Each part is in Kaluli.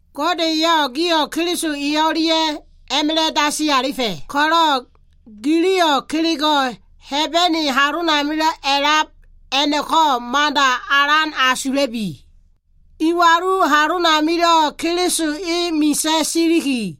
Gode eyo꞉ gio꞉ Keliso e o꞉lia꞉ a꞉ma꞉la꞉ dasi alifa꞉ ko꞉lo꞉, giliyo꞉ kelego꞉ Hebene halomilo꞉ a꞉lab a꞉no꞉ko꞉ mada alan asula꞉lubi. Iwalu halonamio꞉ Keliso e misa꞉ siliki,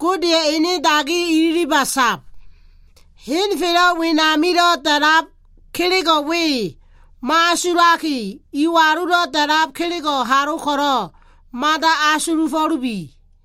Godeya꞉ ene dagi ililiba sab. Henfelo꞉ wenamilo꞉ da꞉lab kelego꞉ we mo꞉asulaki, iwalulo꞉ da꞉lab kelego꞉ halo ko꞉lo꞉ mada asulufo꞉lubi.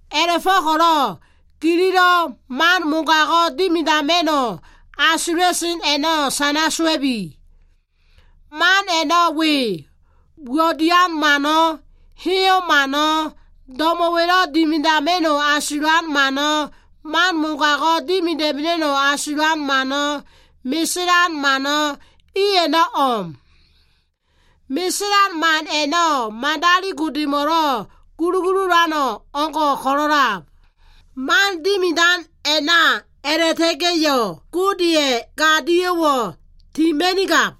A꞉la꞉go꞉ko꞉lo꞉ gililo꞉ man mogago꞉ dimidama꞉no꞉ asula꞉sen a꞉no꞉ sana sowa꞉bi. Man a꞉no꞉ we. Uwo꞉ dian mano꞉, heyo꞉ mano꞉, do꞉mo꞉wa꞉lo꞉ dimidama꞉no꞉ asulan mano꞉, man mogago꞉ dimidama꞉no꞉ asulan mano꞉, meselan mano꞉, i a꞉no꞉ o꞉m. Meselan man a꞉no꞉ madali Godemo꞉lo꞉ gulugululan o꞉ngo꞉ ko꞉lo꞉ a꞉lab. Man dimidan a꞉na a꞉la꞉ta꞉ga꞉yo꞉, Godeya꞉ gadio꞉wo꞉ tima꞉nigab.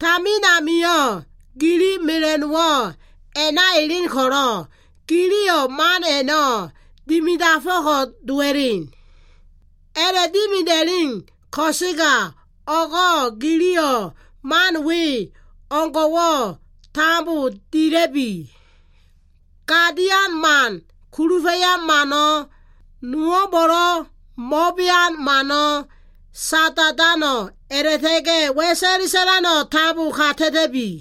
Tamin amio꞉ gili mela꞉no꞉wo꞉ a꞉na elen ko꞉lo꞉, giliyo꞉ man a꞉no꞉ dimidafo꞉ko꞉ dowa꞉len. A꞉la꞉dimida꞉len ko꞉sega, o꞉go꞉ giliyo꞉ man we o꞉ngo꞉wo꞉ tambo dila꞉bi. Gadian mano꞉, kulufa꞉yan mano꞉, nowo꞉mbo꞉lo꞉ mo꞉bean mano꞉, sada꞉dano꞉, a꞉la꞉ta꞉ga꞉ wa꞉sa꞉le sa꞉lano꞉, tambo kata꞉ta꞉bi.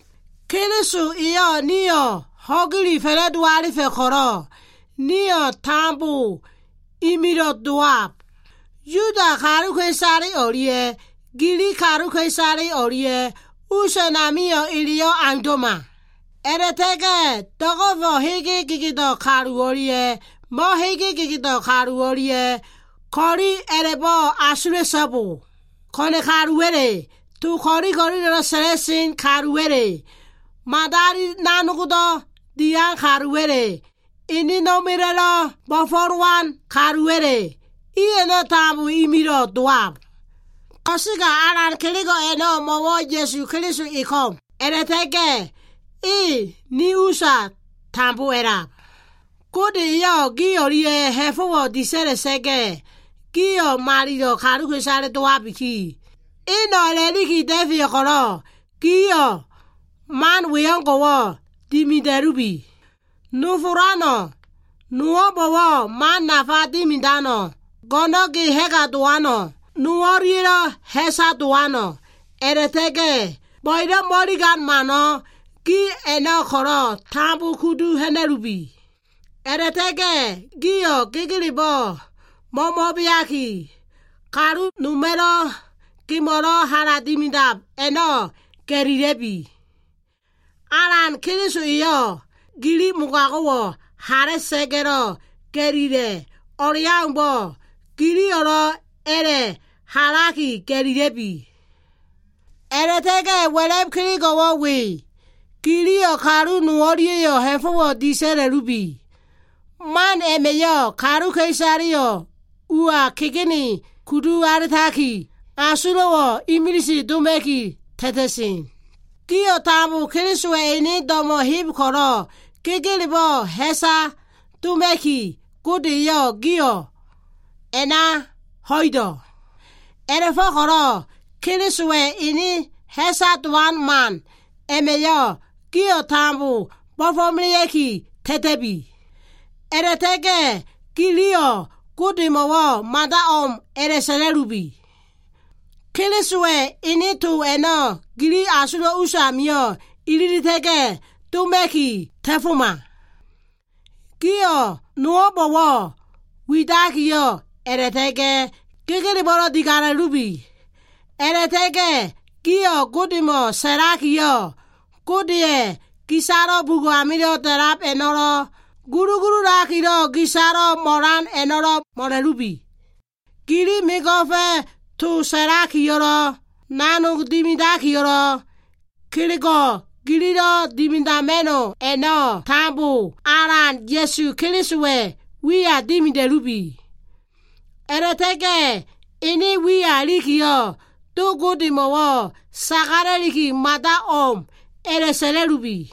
Keliso eyo꞉ nio꞉ ho꞉gile fa꞉la꞉do alifa꞉ ko꞉lo꞉, nio꞉ tambo imilo꞉ dowab. Yuda kaluka꞉isale o꞉lia꞉ Gilig kaluka꞉isale o꞉lia꞉ us amio꞉ eleyo꞉ aundo꞉ma. A꞉la꞉ta꞉ga꞉ do꞉go꞉fo꞉ hege gedeo꞉ kalu o꞉lia꞉ mo꞉hege gedeo꞉ kalu o꞉lia꞉yo꞉ ko꞉li a꞉la꞉bo꞉ asula꞉so꞉bo. Ko꞉na꞉ kaluwa꞉le, to ko꞉lilo꞉lo꞉ sa꞉lan kaluwa꞉le, madalilo꞉ nanog dian kaluwa꞉le, enena꞉ma꞉la꞉lo꞉ bo꞉fo꞉lowan kaluwa꞉le, iyo꞉ tambo imilo꞉ dowab. Ko꞉sega alan kelego꞉ a꞉no꞉ mo꞉wo꞉ Ya꞉su Keliso e ko꞉m, a꞉la꞉ta꞉ga꞉ e ni usa tambo a꞉lab. Gode eyo꞉ gi o꞉lia꞉ ha꞉fo꞉wo꞉ disa꞉la꞉sa꞉ga꞉, gio꞉ malilo꞉ kaluka꞉isale dowabiki, eno꞉ a꞉la꞉liki da꞉feyo꞉ ko꞉lo꞉, giliyo꞉ mano꞉ we o꞉ngo꞉ dimida꞉lubi. Nofolano꞉, nowo꞉mbo꞉wo꞉ man nafa dimidano꞉, go꞉no꞉n ge ha꞉ga dowano꞉, no o꞉lia꞉lo꞉ ha꞉sa dowano꞉ a꞉la꞉ta꞉ga꞉ bo꞉ebo꞉ mo꞉iligan mano꞉, gio꞉ a꞉no꞉ ko꞉lo꞉ tambo kudu ha꞉na꞉lubi. A꞉la꞉ta꞉ga꞉ gio꞉ gegelebo꞉ mo꞉mo꞉beaki, kalu noma꞉lo꞉ gemo꞉lo꞉ hala dimidab a꞉no꞉ ga꞉lila꞉lubi. Alan Keliso eyo꞉ gili mogago꞉wo꞉ hala꞉sa꞉ga꞉lo꞉ ga꞉lila꞉ o꞉leaumbo꞉, giliyo꞉lo꞉ a꞉la꞉ halaki ga꞉lila꞉bi. A꞉la꞉ta꞉ga꞉ wa꞉la꞉b kelego꞉wo꞉ we. Giliyo꞉ kalu nol o꞉lia꞉yo꞉ ha꞉fo꞉wo꞉ disa꞉la꞉lubi. Man a꞉ma꞉yo꞉ kaluka꞉isaleyo꞉ ua kegene kudu alitaki, asulo꞉ imilise doma꞉ki ta꞉ta꞉sen. Gio꞉ tambo Kelisowa꞉ ene do꞉mo꞉ heb ko꞉lo꞉, gegelebo꞉ ha꞉sa doma꞉ki Gode eyo꞉ gio꞉ a꞉na ho꞉ido꞉. A꞉la꞉fo꞉ko꞉lo꞉ Kelisowa꞉ ene ha꞉sa dowan man a꞉ma꞉yo꞉ gio꞉ tambo bo꞉fo꞉melea꞉ki ta꞉ta꞉bi. A꞉la꞉ta꞉ga꞉ giliyo꞉ Godemo꞉wo꞉ mada o꞉m a꞉la꞉sa꞉la꞉lubi. Kelisowa꞉ ene to a꞉no꞉ gili asulo꞉ usa amio꞉ ililita꞉ga꞉ doma꞉ki ta꞉foma. Gio꞉ nowo꞉mbo꞉wo꞉ widaki, a꞉la꞉ta꞉ga꞉ gegelebo꞉ digala꞉lubi. A꞉la꞉ta꞉ga꞉ gio꞉ Godemo꞉ sagalakiyo꞉, Godeya꞉ gisalo꞉ bugo꞉ amilo꞉ da꞉lab a꞉no꞉lo꞉, gulugululakilo꞉ gisalo꞉ mo꞉lan a꞉no꞉lo꞉ mo꞉la꞉lubi. Gili mego꞉fa꞉ to sa꞉lakiyo꞉lo꞉, nanog dimidakiyo꞉lo꞉, kelego꞉ gilo꞉lo꞉ dimidama꞉no꞉ a꞉no꞉ tambo, Alan Ya꞉su Kelisowa꞉ wiya dimida꞉lubi. A꞉la꞉ta꞉ga꞉ ene wiya ilikiyo꞉, Do Godemo꞉wo꞉ sagalaki, mada o꞉m a꞉la꞉sa꞉la꞉lubi.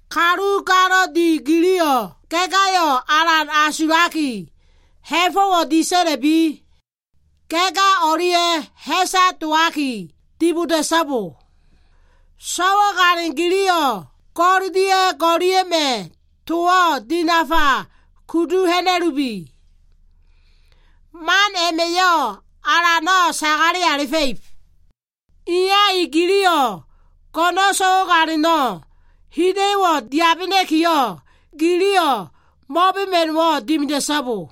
Kalu galo꞉ di giliyo꞉, ga꞉ gayo꞉ alan asulaki, ha꞉fo꞉wo꞉ disa꞉la꞉bi. Ga꞉ ga o꞉lia꞉yo꞉ ha꞉sa dowaki diboda꞉so꞉bo. So꞉wale giliyo꞉ go꞉l dia꞉ go꞉lia꞉ma꞉ towo꞉ dinafa kudu ha꞉na꞉lubi. Man a꞉ma꞉yo꞉ Alano꞉ sagale alifa꞉ib. Iya i giliyo꞉, go꞉no꞉ so꞉wagalino꞉ hida꞉yo꞉wo꞉ dowabena꞉kiyo꞉, giliyo꞉ mo꞉bema꞉no꞉wo꞉ dimida꞉so꞉bo.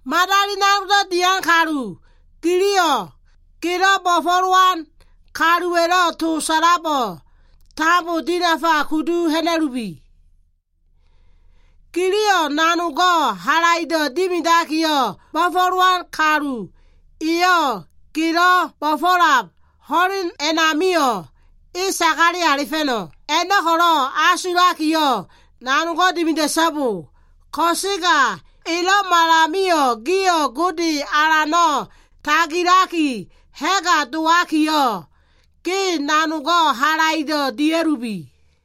Madali nanog dian kalu giliyo꞉ gelo꞉ bo꞉fo꞉lowan kaluwa꞉lo꞉ to sa꞉labo꞉ tambo dinafa kudu ha꞉na꞉lubi. Giliyo꞉ nanogo꞉ halaido꞉ dimidakiyo꞉, bo꞉fo꞉lowan kalu eyo꞉ gelo꞉ bo꞉fo꞉lab ho꞉len a꞉namio꞉, e sagale alifa꞉no꞉ a꞉no꞉ko꞉ asulakiyo꞉ nanog dimida꞉so꞉bo. Ko꞉sega elo꞉malamio꞉lo꞉ gio꞉ Gode Alano꞉ tagilaki ha꞉ga dowakiyo꞉, ge nanogo꞉ halaido꞉ dia꞉lubi.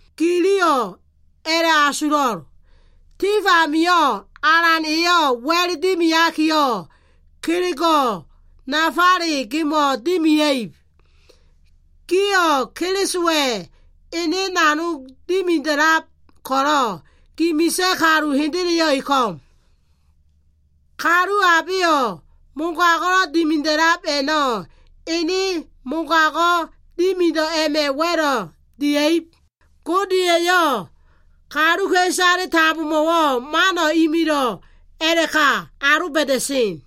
Giliyo꞉ a꞉la꞉asulo꞉, tif amio꞉ Alan eyo꞉ wa꞉l dimiakiyo꞉, kelego꞉ nafaleyo꞉ gemo꞉ dimia꞉ib. Gio꞉ Kelisowa꞉ ene nanog dimida꞉lab ko꞉lo꞉, gi misa꞉ kalu hendeleyo꞉ e ko꞉m. Kalu abeyo꞉ mogago꞉lo꞉ dimida꞉lab a꞉no꞉ ene mogago꞉ dimido꞉ a꞉ma꞉ wa꞉lo꞉ dia꞉ib. Gode eyo꞉ kaluka꞉isale tambomo꞉wo꞉ mano꞉ imilo꞉ a꞉la꞉ka aloba꞉da꞉sen.